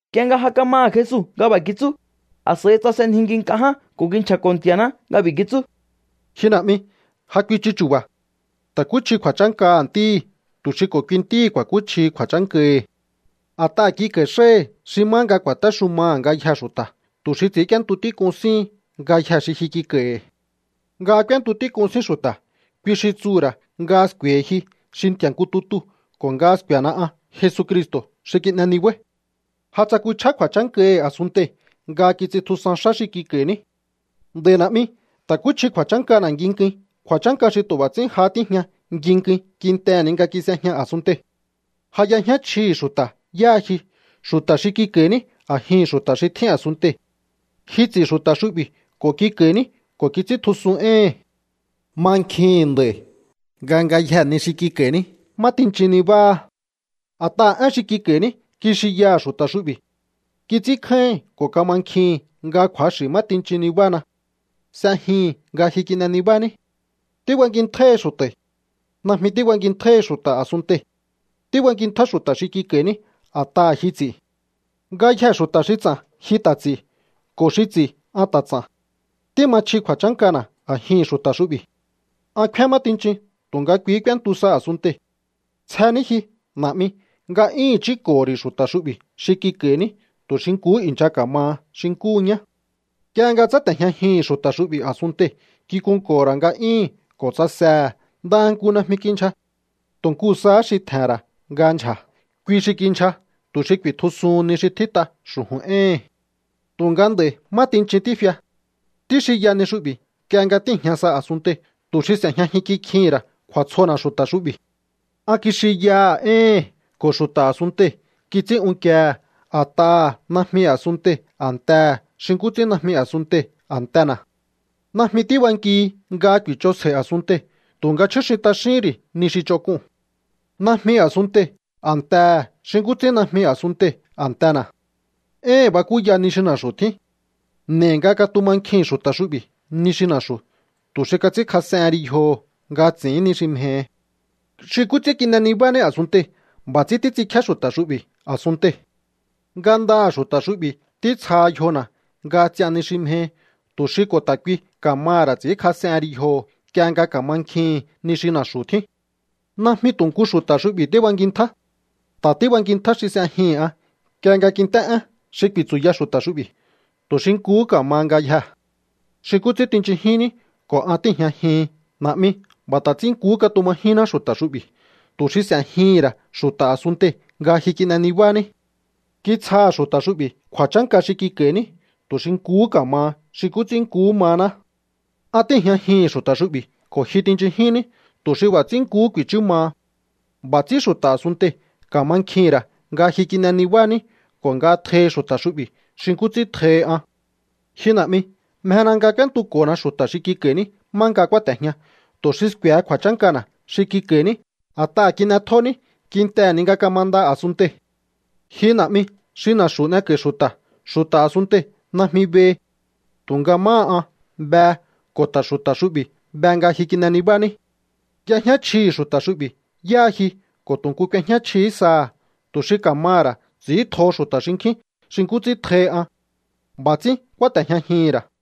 Nk'ie nga ja kamaha̱ Jesu nga b'a̱ kitsú, a̱s'a̱i tsasenjinki nk'a ján ko̱ kinchja̱ko̱ Nti̱a̱ná nga b'i̱ kitsú: —Ji Na̱'mi, ja kuichu chu̱ba̱. Ta̱kúchji kju̱a̱chánkaha̱ Ntíhi̱ tu̱ xi ko̱ kui Ntíhi̱ ku̱a̱kúchjihi kju̱a̱chánkahi̱. A̱t'aha̱ kik'a̱i̱ xáhi̱ xi má nga ku̱a̱téxumaha̱ ngayjee̱ xu̱ta̱, tu̱ xi ts'i̱ínk'íéntu tík'un síhin ngayjee̱ xi ji kik'a̱i̱hi̱. Nga k'úéntu tík'un sín xu̱ta̱, kui xi tsuhu̱ ra̱ nga sku̱e̱hi ji xi Nti̱a̱ nku tutuu̱ ko̱ nga sku̱e̱na an Jesucristo̱ xi kin'e nibáí. ’Ja tsakuchjá kju̱a̱chánkahi̱ a̱sunntei̱ nga kits'intjusan xá xi kik'a̱i̱ní. Nd'a̱i̱ Na̱'mi, ta̱kúchji kju̱a̱chánkana̱ nginkuin, kju̱a̱chánka xi tu̱ b'a̱ ts'ín jahá tíjñana nginkuin kintehe̱ ni nga kis'ejña a̱sunntei̱. ’Ja y'ejñá chjihi̱ xu̱ta̱ yáha ji, xu̱ta̱ xi kik'a̱i̱ní a̱jihi̱n xu̱ta̱ xi tjín a̱sunntei̱. Ji ts'i̱ xu̱ta̱ xu'bi̱ ko̱ kik'a̱i̱ní, ko̱ kits'íntjusun éhi̱n. Mankjihi̱n nd'a̱i̱ nga ngayjee̱ ni xi kik'a̱i̱ní má tinchin nibáha. A̱t'aha̱ én xi kik'a̱i̱ní, kixinyaha̱ xu̱ta̱ xu'bi̱. Kits'ínkjáíhi̱n ko̱ kamankjihi̱n nga kju̱axi̱ nga má tinchin nibahana. S'ejihi̱n nga ji kin'e nibání. ’Tíbankintjáíhi xu̱ta̱i̱. Najmi tíbankintjáíhi xu̱ta̱ a̱sunntei̱. Tíbankintja xu̱ta̱ xi kik'a̱i̱ní a̱t'aha̱ ji ts'i̱. Ngayjee̱ xu̱ta̱ xi ts'a̱n ji ta̱ ts'i̱, ko̱ xi ts'i̱ an ta̱ ts'a̱n. Tíma chji kju̱a̱chánkana̱ a̱jihi̱n xu̱ta̱ xu'bi̱. ’An kfíán má tinchin, tu̱nga kui k'úéntu sa a̱sunntei̱. Tsje ní ji, Na̱'mi. Nga'yíhi̱n chúnko̱ho̱ ri̱ xu̱ta̱ xu'bi̱ xi kik'a̱i̱ní tu̱ xi nkuhú i̱ncha ka̱maha xi nkúhu ñá. Nk'ie nga tsáte̱jñajihi̱n xu̱ta̱ xu'bi̱ a̱sunntei̱, kikunko̱ho̱ ra̱ nga'yíhi̱n ko̱ tsasehe̱. Ndaha nku najmi kindyja. Tu̱ nku sahá xi tje̱he̱n ra̱ nga ndyja̱, kui xi kindyja tu̱ xi ku̱i̱tjusuhun ni xi tjít'a xu̱ju̱n éhi̱n. ’Tu̱nga nd'a̱i̱ má tinchin tífia. Tíxinya ni xu'bi̱ nk'ie nga tíi̱jña sa a̱sunntei̱ tu̱ xi s'e̱jñajin kikjihi̱n ra̱ kju̱a̱tsjona̱ xu̱ta̱ xu'bi̱. An kixinyaha̱ éhi̱n, ko̱ xu̱ta̱ a̱sunntei̱ kits'ín unkiehe̱ a̱t'aha̱ najmi a̱sunntei̱ a̱ntehe̱ xi nkú ts'ín najmi a̱sunntei̱ a̱ntena̱. Najmi tíbankihi nga ku̱i̱ch'onsjei a̱sunntei̱, tu̱nga chjúxin t'axíhín ri̱ ni xi ch'onk'uu̱n. Najmi a̱sunntei̱ a̱ntehe̱ xi nkú ts'ín najmi a̱sunntei̱ a̱ntena̱. Éhi̱n bakúya ni xi na̱xu̱ tjín. N'e̱i nga katumankjihi̱n xu̱ta̱ xu'bi̱ ni xi na̱xu̱, tu̱ xi kats'ínkjas'ehen ri yjoho̱ nga ts'i̱ín ni xi mjehi. Xi nkú ts'ín kin'e nibání a̱sunntei̱, b'a̱ ts'ín títs'inkjíá xu̱ta̱ xu'bi̱ a̱sunntei̱. Ngandaha̱ xu̱ta̱ xu'bi̱ títsjaha̱ yjona̱ nga ts'ian ni xi mjehi, tu̱ xi ko̱ ta̱ kui ka̱maha̱ ra̱ ts'i̱ínkjas'ehen ri yjoho̱ nk'ie nga ka̱mankjihi̱n ni xi na̱xu̱ tjín. ’Najmi tu̱ nku xu̱ta̱ xu'bi̱ tíbankintja. Ta̱ tíbankintjá xi s'e̱jihi̱n an nk'ie nga ku̱i̱nt'é én xi ku̱i̱tsu̱ya xu̱ta̱ xu'bi̱, tu̱ xi nkuhú ka̱maha ngayjee̱. Xi nkú ts'ín tinchunjinní ko̱ an tíi̱jñajihin, Na̱'mi, b'a̱ ta̱ ts'ín nkuhú katumajinná xu̱ta̱ xu'bi̱, tu̱ xi s'e̱jihi̱n ra̱ xu̱ta̱ a̱sunntei̱ nga ji kin'e nibání. Kitsjaha̱ xu̱ta̱ xu'bi̱ kju̱a̱chánka xi kik'a̱i̱ní tu̱ xi nkuhú ka̱maha xi nkú ts'ín nkuhú mahaná. An tíi̱jñajihi̱n xu̱ta̱ xu'bi̱ ko̱ ji tinchunjínní tu̱ xi b'a̱ ts'ín nkuhú ku̱i̱chú maha. B'a̱ ts'ín xu̱ta̱ a̱sunntei̱ ka̱mankjihi̱n ra̱ nga ji kin'e nibání ko̱ nga tjohi xu̱ta̱ xu'bi̱ xi nkú ts'ín tjohi an. ’Ji Na̱'mi, mjena nga k'úéntuko̱na xu̱ta̱ xi kik'a̱i̱ní má nga kúáte̱jña, tu̱ xi sku̱e̱he kju̱a̱chánkana̱ xi kik'a̱i̱ní a̱t'aha̱ kin'etjóní kintehe̱ ni nga kamanda a̱sunntei̱. Ji Na̱'mi xi na̱xu̱ n'eko̱i xu̱ta̱, xu̱ta̱ a̱sunntei̱ najmi behi. Tu̱nga máha an, behe ko̱ ta̱ xu̱ta̱ xu'bi̱ be nga ji kin'e nibání. Y'ejñá chjihi̱ xu̱ta̱ xu'bi̱ yáha ji ko̱ tu̱ nku k'uejñá chjihí saha̱, tu̱ xi ka̱maha̱ ra̱ ts'i̱íntjoho xu̱ta̱ xinkjín xi nkú ts'ín tjohi an. B'a̱ ts'ín kúáte̱jñajihi̱n ra̱.